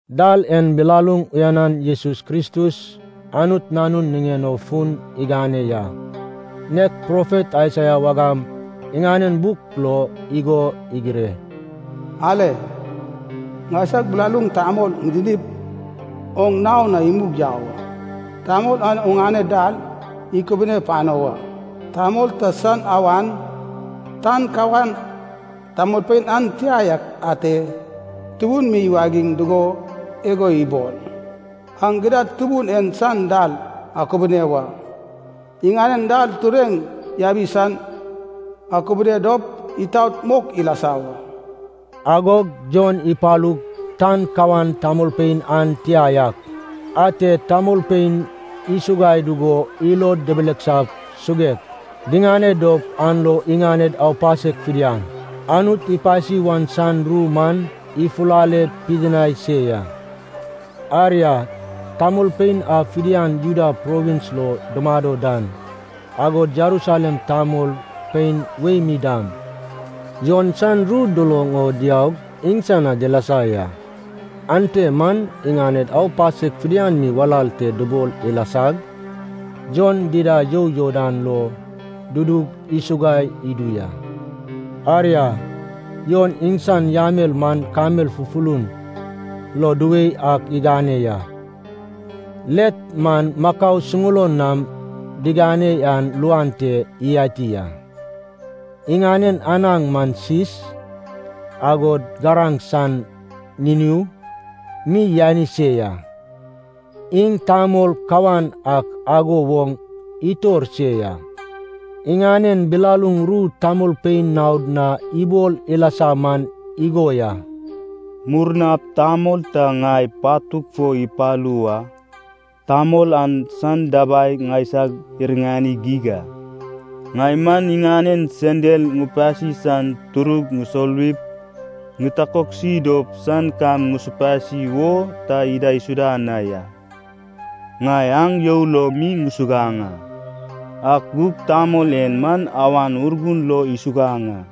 Dal en bilaluŋ uyanan Jesus Kristus Anut Nanun niŋen o fun igane ya. Nek profet Aisaia wagam iŋanen buk lo igo igire, “Ale. Ŋaisag bilaluŋ tamol ŋidinip, oŋ nao na imug yau a. Tamol an oŋane dal ikubune pano wa.” “Tamol ta san awan, tan kawan tamolpein an tia yak ate tubun mi iwagiŋ dugo igo ibol: ‘Aŋ gidad Tubun en san dal akubune wa, iŋanen dal tureŋ yabi san akubune dop itaot mok ilasa wa.’” Agog Jon ipalug, tan kawan tamolpein an tia yak ate tamolpein isuguai dugo ilod dibilisap suguek diŋane dop an lo iŋaned aupasek fidian Anut ipasi wan san ru man ifulale pidinai se ya. Aria, tamolpein a fidian Judea provins lo dumado dan, agod Jerusalem tamolpein wei mi dam Jon san ru duloŋ o diaug iŋsan na dilasa ya. Ante man iŋaned aupasek fidian mi walal te dubol ilasag, Jon dida you Jordan lo dudug isuguai idu ya. Aria, Jon iŋsan yamel man kamel fufulun lo duwei ak igane ya. Let man makau suŋulon nam digane an luan te iyati a. Iŋanen anaŋ man sis, agod garaŋ san niniu mi yani se ya. Iŋ tamol kawan ak ago woŋ itor se ya. Iŋanen bilaluŋ ru tamolpein naod na ibol ilasa man igo ya. “Murnap tamol ta ŋai patug fo ipalu wa, tamol an san dabai ŋaisag iriŋani geig a. Ŋai man iŋanen sendal ŋupasi san turug ŋusoluwip ŋitakoksi dop san kam ŋusupasi wo ta idaisuda na ya. Ŋai aŋ you lo mi ŋusuguaŋ a. Ak gug tamol en man Awan Urgun lo isuguaŋ a.”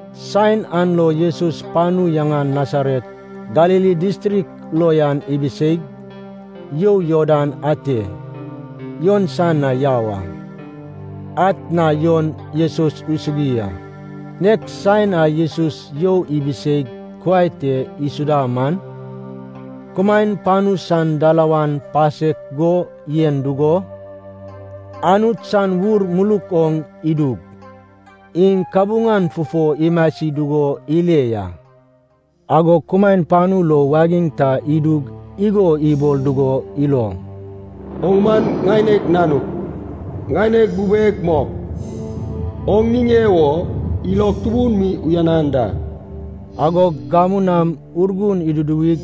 Saen an lo Jesus panu yaŋan Nasaret Galili distrik lo yan ibiseig, you Jordan ate Jon san na yau a. Atna Jon Jesus isugui a. Nek saen a Jesus you ibiseig kuai te isuda man, kumaen panu san dalawan pasek go yen dugo, Anut san Ur muluk oŋ idug, iŋ kabuŋan fufo imasi dugo ile ya. Agog kumaen panu lo wagiŋ ta idug igo ibol dugo iloŋ, “Oŋ man ŋaineg Nanug, ŋaineg bubeg mok, oŋ niŋe wo ilog tubun mi uyanan da.” Agog gamu nam Urgun iduduwig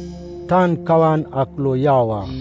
tan kawan ak lo yau a.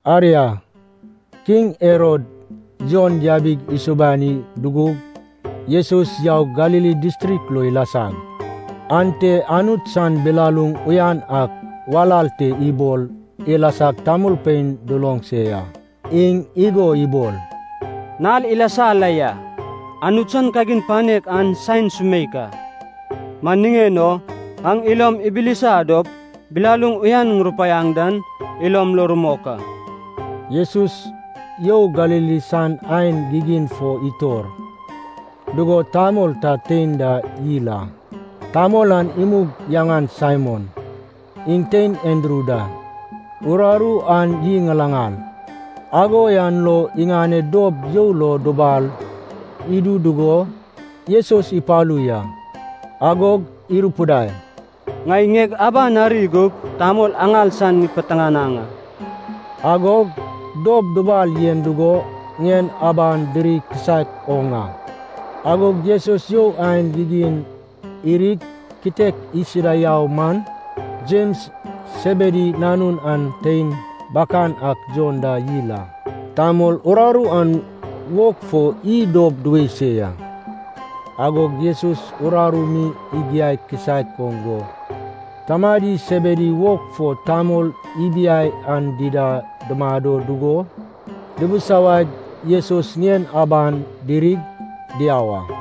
Aria, kiŋ Herod Jon yabig isubani dugug, Jesus yaug Galili distrik lo ilasag, ante Anut san bilaluŋ uyan ak walal te ibol ilasag tamolpein duloŋ se ya. Iŋ igo ibol, “Nal ilasa la ya, Anut san kagin panek an san saen sumeik a. Man niŋen o aŋ ilom ibilisa dop bilaluŋ uyan ŋurupaiaŋ dan ilom lo rumok a.” Jesus You Galili san aen gigin fo itor dugo tamol ta tein da yil a. Tamol an imug yaŋan Saimon, iŋ tein Andru da. Uraru an iy ŋalaŋal, ago yan lo iŋaned dob you lo dubal idu dugo, Jesus ipalu ya. Agog irupidai, “Ŋai ŋieg abag ari gup tamol aŋal san ŋipiteŋanaŋ a.” Agog dob dubal yen dugo ŋien aban diri kisaek oŋ a. Agog Jesus you aen gigin irig kitek isuda yau man, Jems Sebedi nanun an tein bakan ak Jon da yil a. Tamol uraru an wog fo iy dob duwei se ya. Agog Jesus uraru mi igiai kisaek oŋ go tamadi Sebedi wog fo tamol ibiai an dida dumado dugo dibisawaig Jesus ŋien aban dirig diau a.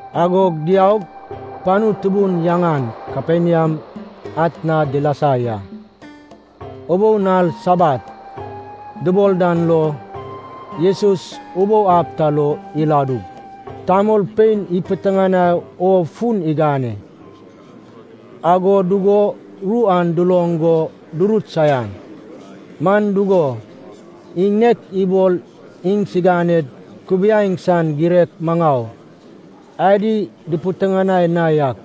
Agog diaug, panu tubun yaŋan Kaperniam atna dilasa ya. Ubou nal, Sabat dubol dan lo, Jesus ubou ab ta lo iladug tamolpein ipiteŋanai o fun igane. Ago dugo ru an duloŋ go durut saian. Man dugo, iŋ nek ibol iŋsiganed kubaieŋ san girek maŋau adi dupiteŋanai na yak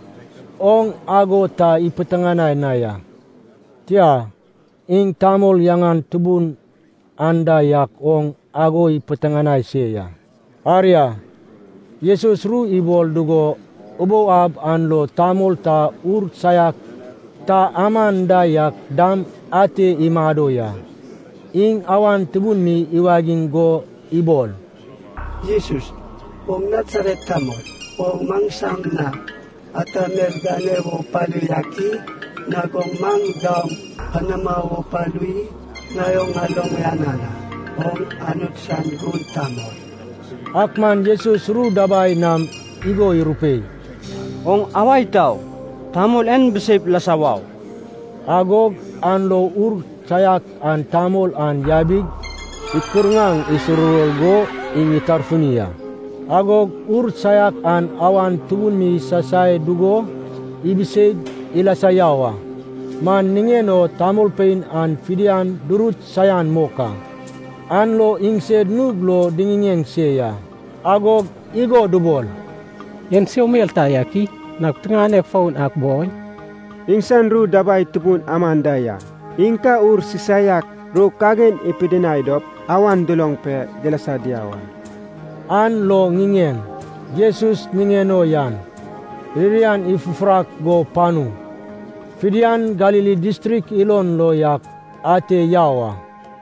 oŋ ago ta ipiteŋanai na ya. Tia, iŋ tamol yaŋan tubun anda yak oŋ ago ipiteŋanai se ya. Aria, Jesus ru ibol dugo, ubou ab an lo tamol ta ur saiak ta aman da yak dam ate imado ya. Iŋ awan tubun mi iwagiŋ go ibol, “Jesus, oŋ Nasaret tamol, oŋ maŋsama na ata mel gane wo palu yak i? Nag oŋ maŋ daoŋ panama wo palu i? Ŋai oŋ ŋaloŋ uyanan a, oŋ Anut san gun tamol.” Ak man Jesus ru dabai nam igo irupei, “Oŋ awa itau. Tamol en biseip lasa wau!” Agog an lo ur saiak an tamol an yabig, ikirŋaŋ isuruwor go iŋ itarfuni a. Agog ur saiak an awan tubun mi isasai dugo ibiseig ilasa yau a. Man niŋen o tamolpein an fidian durut saian mok a, an lo iŋsed nug lo diŋiŋeŋ se ya, agog igo dubol, “En so mel ta yak i? Nag piteŋanek foun ak boi? Iŋsan ru dabai tubun aman da ya. Iŋ ka ur sisaiak ru kagin ipidinai dop iŋ awan duloŋ pe dilasa diau a.” An lo ŋiŋeŋ Jesus niŋen o yan ririan ifufurak go panu fidian Galili distrik ilon lo yak ate yau a.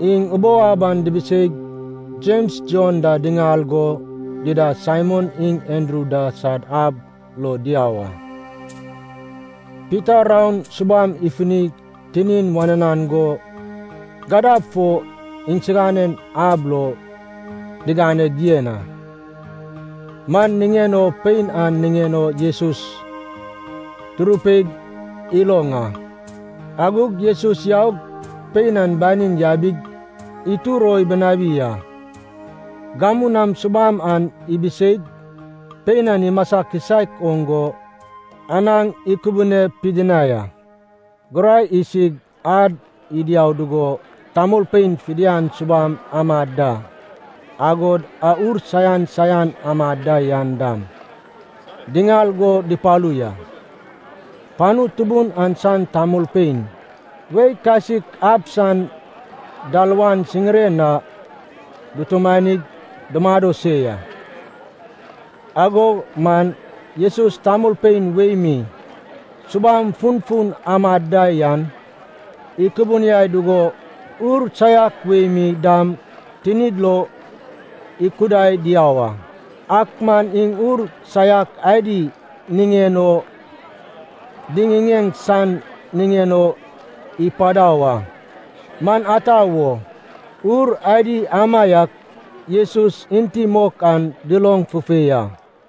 Iŋ ubou ab an dibiseig Jems Jon da diŋal go dida Saimon iŋ Andru da sad ab lo diau a. Pita raon subam ifunig tinin wananan go, gadab fo iŋsiganen ab lo diganeg yen a. Man niŋen o pein an niŋen o Jesus durupeig iloŋ a. Agog Jesus yaug, pein an banin yabig itur o ibinawi a. Gamu nam subam an ibiseig pein an imasa kisaek oŋ go anaŋ ikubune pidinai a. Gurai isig ad idiau dugo, tamolpein fidian subam amad da, agod a ur saian saian amad da yan dam, diŋal go dupalu ya. Panu tubun an san tamolpein wei kasik ab san dalawan siŋiren na dutumanig dumado se ya. Ago man Jesus tamolpein wei mi subam funfun amad da yan ikubuniai dugo ur saiak wei mi dam tinid lo ikudai diau a. Ak man iŋ ur saiak adi niŋen o diŋiŋeŋ san niŋen o ipadau a, man ata wo, ur adi amaiak Jesus enti mok an duloŋ fufei a.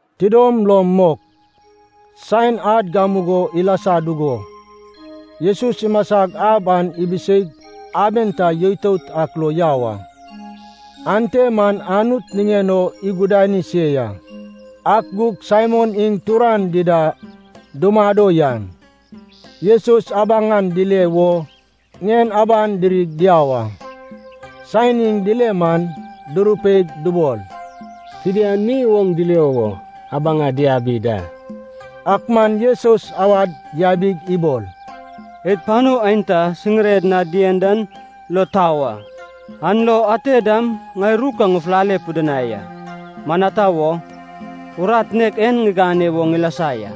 Tidom lom mok, saen ad gamugo ilasa dugo, Jesus imasag ab an ibiseig aben ta yoitout ak lo yau a. Ante man Anut niŋen o igudani se ya. Ak gug Saimon iŋ turan dida dumado yan, Jesus abaŋan dile wo ŋien aban dirig diau a. Saen iŋ dile man durupeig dubol, “Fidian mi oŋ dilio wo abaŋa diabi da.” Ak man Jesus awad yabig ibol, “Id panu aenta siŋired na dien dan lo tau a. An lo ate dam ŋai ru ka ŋufulale pidinai a. Man ata wo, urat nek en ŋigane wo ŋilasa ya.”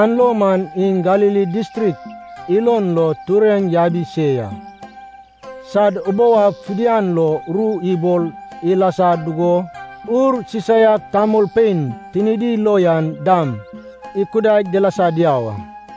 An lo man iŋ Galili distrik ilon lo tureŋ yabi se ya, sad ubou ab fidian lo ru ibol ilasa dugo ur sisaiak tamolpein tinidi lo yan dam ikudaig dilasa diau a.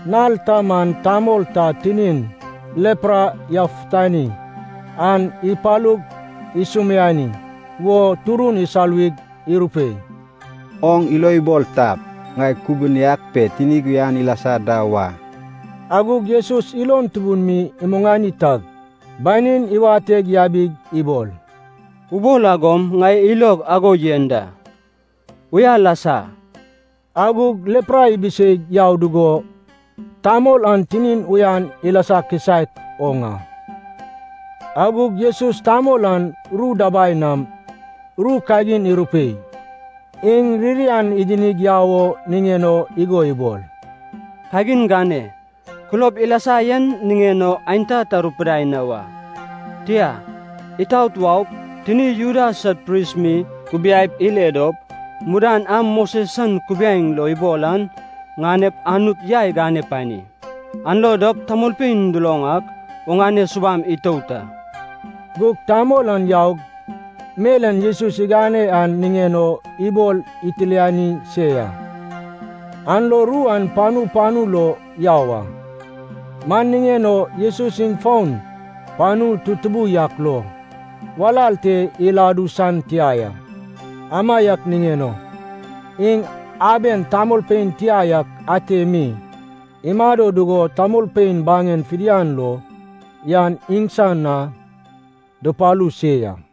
Nal ta man tamol ta tinin lepra yafutani an ipalug isumiani wo turun isoluwig irupei, “Oŋ ilo ibol tap, ŋai kubuniag pe tinig uyan ilasa da wa.” Agog Jesus ilon tubun mi imuŋani tag banin iwateg yabig ibol, “Ubol agom ŋai ilog ago yen da, uya lasa.” Agog lepra ibiseig yau dugo tamol an tinin uyan ilasa kisaek oŋ a. Agog Jesus tamol an ru dabai nam ru kagin irupei. Iŋ ririan idinig yau o niŋen o igo ibol. “Kagin gane, kulob ilasa yen niŋen o aenta ta rupidai na wa. Tia, itaot waup, tini Juda sad pris mi kubiaip ile dop, mudan a Moses san kubiaeŋ lo ibol an ŋanep Anut yai gane pani. An lo dop tamolpein duloŋ ak oŋane subam itout a.” Gug tamol an yaug, mel en Jesus igane an niŋen o ibol itilani se ya, an lo ru an panu panu lo yau a. Man niŋen o Jesus iŋ fon panu tutubu yak lo walal te iladu san tia ya. Amaiak niŋen o iŋ aben tamolpein tia yak ante mi imado dugo tamolpein baŋen fidian lo yan iŋsan na dupalu se ya.